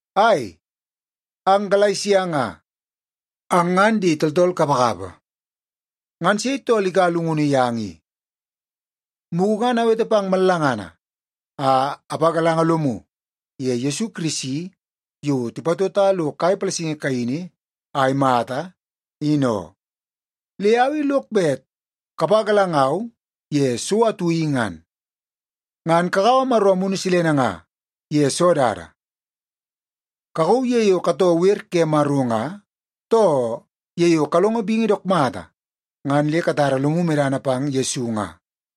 Ai, ang Galesia nga, ang ngan di tooltool kapakapa! Ngan sei tool ikaua llungunu yang i? Mugu ngan awete pang mallangana a apagalanga lomu ye Yesu Kirisi yo tipatota lo kai palasingi kaini a imata, in oo. Le au i lok bet kapagalangau ye so atu i ngan. Ngan kakaua Maro Amunu Silene nga ye soo dada? Kakauu ye yo katoo wer ke Maro nga, too ye yo kalongo bingi dook mata ngan le katara lomu medana pang Yesu nga?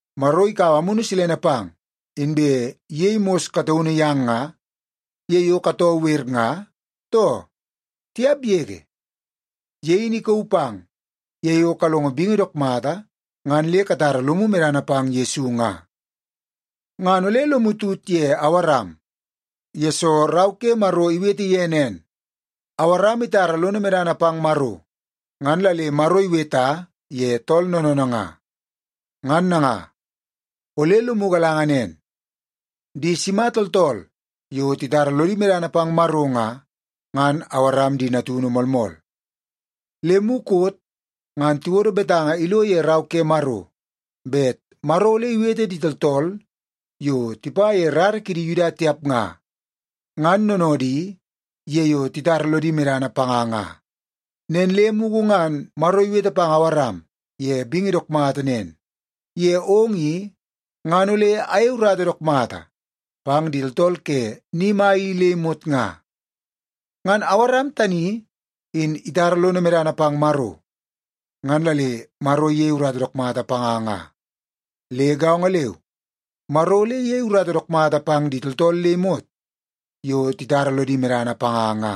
Maro ikaua Amunu Silene pang, inbe iyei mos kataunu yang nga, ye yo katoo wer nga, too? Tiap yege! Ye in ikauu pang ye yo kalongo bingi dook mata ngan le katara lomu medana pang Yesu nga. Ngan ole lomu tut ye Awaram, yesoo Rau ke Maro iwete ye nen, “Awaram itara lono medana pang Maro, ngan la le Maro iweta ye tool noonoonoo nga.” Ngan nanga, ole lomu galanga nen, di sima tooltool yo titara lodi medana pang Maro nga, ngan Awaram di natunu moolmool. Le mukot ngan tiwodo betanga ilo ye Rau ke Maro bet Maro ole iwete di tooltool yo tipa ye rara kidi Yuda tiap nga, ngan noonoodi ye yo titara lodi medana panga nga. Nen le mugu ngan Maro iwete pang Awaram ye bingi dook mata nen, “Ye ong i, ngan ole ayei urata dook mata pang di tooltool ke ni mai i le imot nga.” Ngan Awaram tani in itara lono medana pang Maro, ngan la le Maro iyei urata dook mata panga nga. Le gaongo leu, Maro ole iyei urata dook mata pang di tooltool le imot yo titara lodi medana panga nga.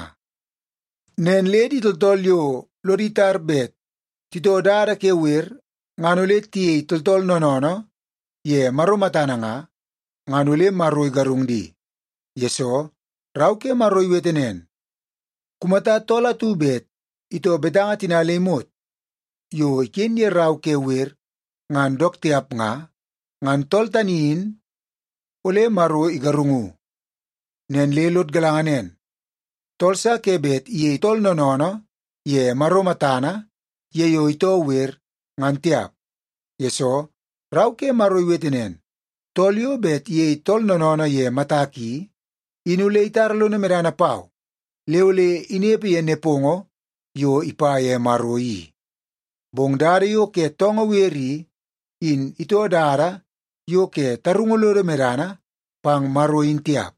Nen le di tooltool yo lodi tar bet titoo dada ke wer ngan ole tiyei tooltool noonoonoo ye Maro matana nga, ngan ole Maro igarung di. Yesoo, Rau ke Maro iwete nen, “Kumata tool atu bet itoo betanga tina le imot yo iken ye Rau ke Wer ngan dook tiap nga, ngan tool tani in ole Maro igarungu.” Nen le lod galanga nen, tool sa ke bet iyei tool noonoonoo ye Maro matana ye yo itoo wer, ngan tiap. Yesoo, Rau ke Maro iwete nen, “Tool yo bet iyei tool noonoonoo ye matak i, in ole itara lono medana pau le ole inepe ye nepongo yo ipa ye Maro i.” Bong dada yo ke toongoo wer i, in itoo dada yo ke tarungu lodo medana pang Maro in tiap.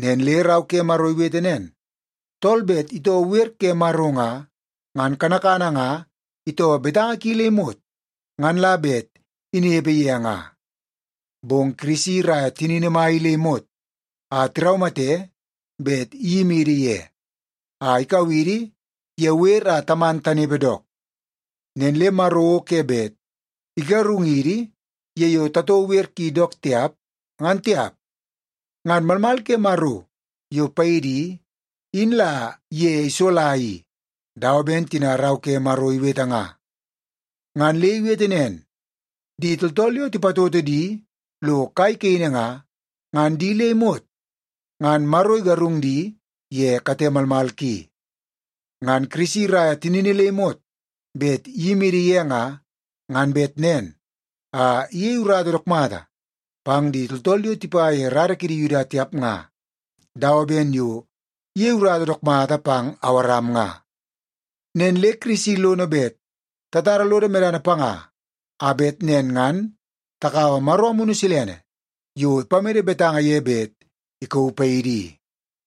Nen le Rau ke Maro iwete nen, “Tool bet itoo wer ke Maro nga, ngan kanakana nga itoo betanga ki le imot ngan la bet inepe ye nga.” Bong Kirisi iraia tinini mai i le imot a tiraumate bet iyimidi ye a ikau idi ye wer a taman tanepe dook. Nen le Maro o ke bet igarungidi ye yo tatoo wer ki dook tiap, ngan tiap. Ngan malmal ke Maro yo paidi i, in la ye isola i dawa ben tina Rau ke Maro iwete nga. Ngan le iwete nen, “Di tooltool yo tipatoto di lo kai kaini nga, ngan di le imot ngan Maro igarung di ye kate malmal ki.” Ngan Kirisi iraia tinini le imot bet iyimidi ye nga, ngan bet nen a iyei urata dook mata pang di tooltool yo tipa ye rara kidi Yuda tiap nga, dawa ben yo iyei urata dook mata pang Awaram nga. Nen le Kirisi lono bet tatara lodo medana panga a bet nen ngan takaua Maro Amunu Silene yo ipamede betanga ye bet ikauu paidi i.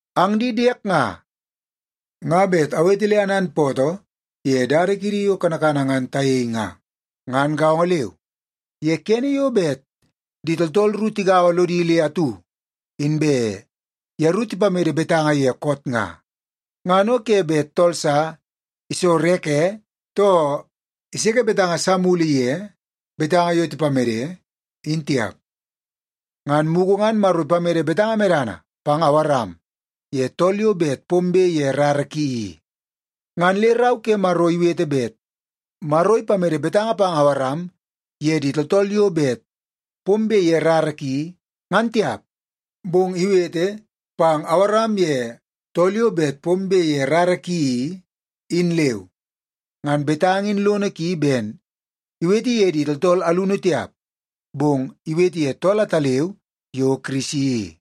Ang di diek nga, nga bet awete le ananpootoo ye dada kiidi yo kanakana ngan tayei nga. Ngan gaongo leu, ye kene yo bet di tooltool ru tigaua lodi le atu inbe yeru tipamede betanga ye koot nga, ngan o ke bet tool sa isorreke, too iseke betanga sa mulu ye betanga yo tipamede, in tiap. Ngan mugu ngan Maro ipamede betanga medana pang Awaram ye tool yo bet pombe ye rara ki i. Ngan le Rau ke Maro iwete bet Maro ipamede betanga pang Awaram ye di tooltool yo bet pombe ye rara ki, ngan tiap, bong iwete, “pang Awaram ye tool yo bet pombe ye rara ki i,” in leu. Ngan betanga in lono ki ben iwete ye di tooltool alunu tiap, bong iwete ye tool ataleu yo Kirisi i.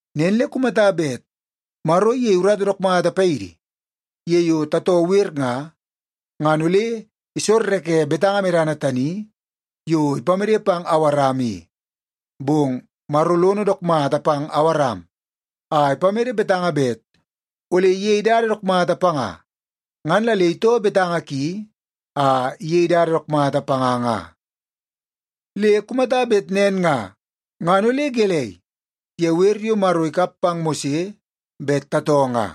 Nen le kumata bet Maro iyei urata dook mata paidi ye yo tatoo wer nga, ngan ole isorreke betanga medana tani yo ipamede pang Awaram i. Bong Maro lono dook mata pang Awaram a ipamede betanga bet ole iyei dada dook mata panga, ngan la le itoo betanga ki a iyei dada dook mata panga nga. Le kumata bet nen nga, ngan ole gelei ye wer yo Maro ikap pang Mose bet tatoo nga?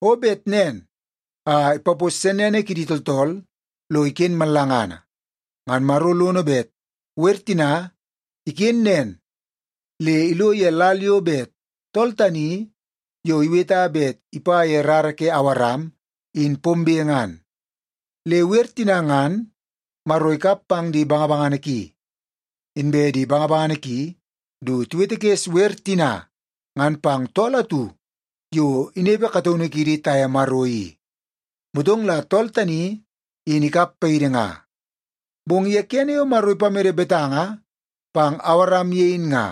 O bet nen a ipapos sennene kidi tooltool lo iken mallangana. Ngan Maro lono bet wer tina iken nen le ilo ye lal yo bet tool tani yo iweta bet ipa ye rara ke Awaram in pombe ngan. Le wer tina ngan Maro ikap pang di bangabangana ki, inbe di bangabangana ki du tiwetekes wer tina ngan pang tool atu yo inepe kataunu kiidi taye Maro i. Motong la tool tani, in ikap paidi nga. Bong ye kene yo Maro ipamede betanga pang Awaram ye in nga,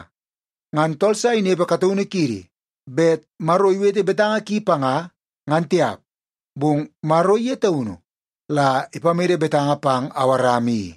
ngan tool sa inepe kataunu kidi bet Maro iwete betanga ki panga ngan tiap. Bong Maro ye taunu la ipamede betanga pang Awaram i.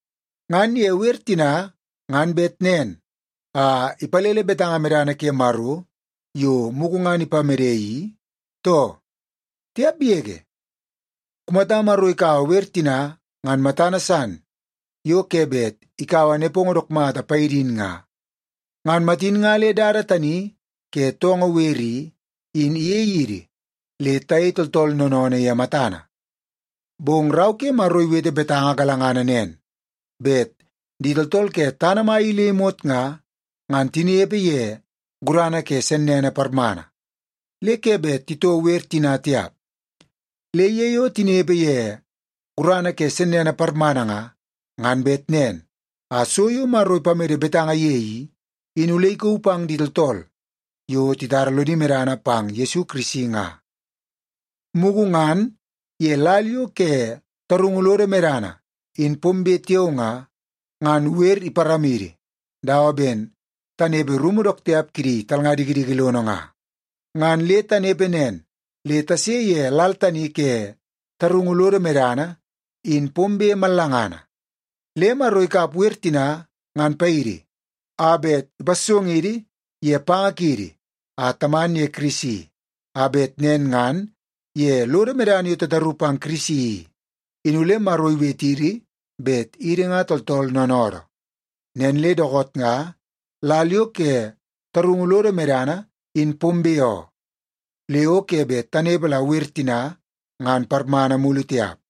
Ngan ye wer tina ngan bet nen a ipalele betanga medana ke Maro yo mugu ngan ipamede i too? Tiap yege! Kumata Maro ikaua wer tina ngan matana san yo ke bet ikaua nepongo dook mata paidi in nga, ngan matin nga le dada tani ke toongoo wer i, in iyei idi le tayei tooltool noonoonoo ye matana. Bong Rau ke Maro iwete betanga galangana nen bet di tooltool ke tana mai i le imot nga, ngan tinepe ye gurana ke sennene parmana, le ke bet titoo wer tina tiap. Le ye yo tinepe ye gurana ke sennene parmana nga, ngan bet nen a so yo Maro ipamede betanga ye i, in ole ikauu pang di tooltool yo titara lodi medana pang Yesu Kirisi nga. Mugu ngan ye lal yo ke tarungu lodo medana in pombe tiao nga, ngan wer iparamidi dawa ben tanepe rumu dook tiap kidi talnga dikidiki lono nga. Ngan le tanepe nen le tase ye lal tani ke tarungu lodo medana in pombe mallangana. Le Maro ikap wer tina ngan paidi a bet ipassongidi ye panga kiidi a taman ye Kirisi. A bet nen ngan ye lodo medana yo tataru pang Kirisi i, in ole Maro iwetidi bet idi nga tooltool noonoodoo. Nen le dookoot nga lal yo ke tarungu lodo medana in pombe oo. Le o ke bet tanepe la wer tina ngan parmana mulu tiap.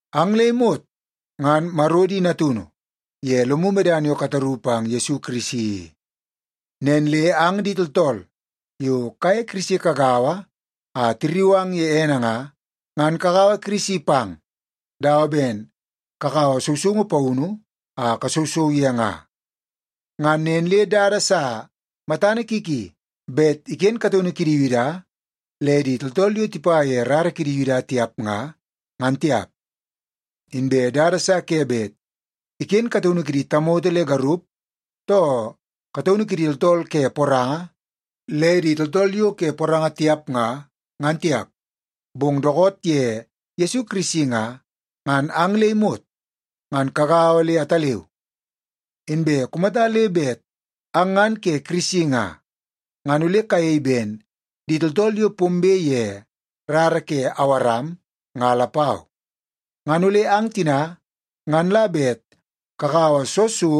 Ang le imot ngan Maro di natunu ye lomu medana yo kataru pang Yesu Kirisi i. Nen le ang di tooltool yo kaye Kirisi kagaua a tirriu ang ye ene nga, ngan kakaua Kirisi pang dawa ben kakaua sousoungu paunu a kasousou ye nga. Ngan nen le dada sa matana ki ki bet iken kataunu kidi Yuda le di tooltool yo tipa ye rara kidi Yuda tiap nga, ngan tiap. Inbe dada sa ke bet iken kataunu kidi tamoto le garup, too kataunu kidi tooltool ke poranga le di tooltool yo ke poranga tiap nga, ngan tiap. Bong dookoot ye Yesu Kirisi nga, ngan ang le imot ngan kagaua le ataleu. Inbe kumata le bet ang ngan ke Kirisi nga, ngan ole kayei ben di tooltool yo pombe ye rara ke Awaram nga lapau. Ngan ole ang tina ngan la bet kakaua soo so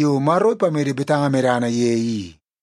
yo Maro ipamede betanga medana ye i.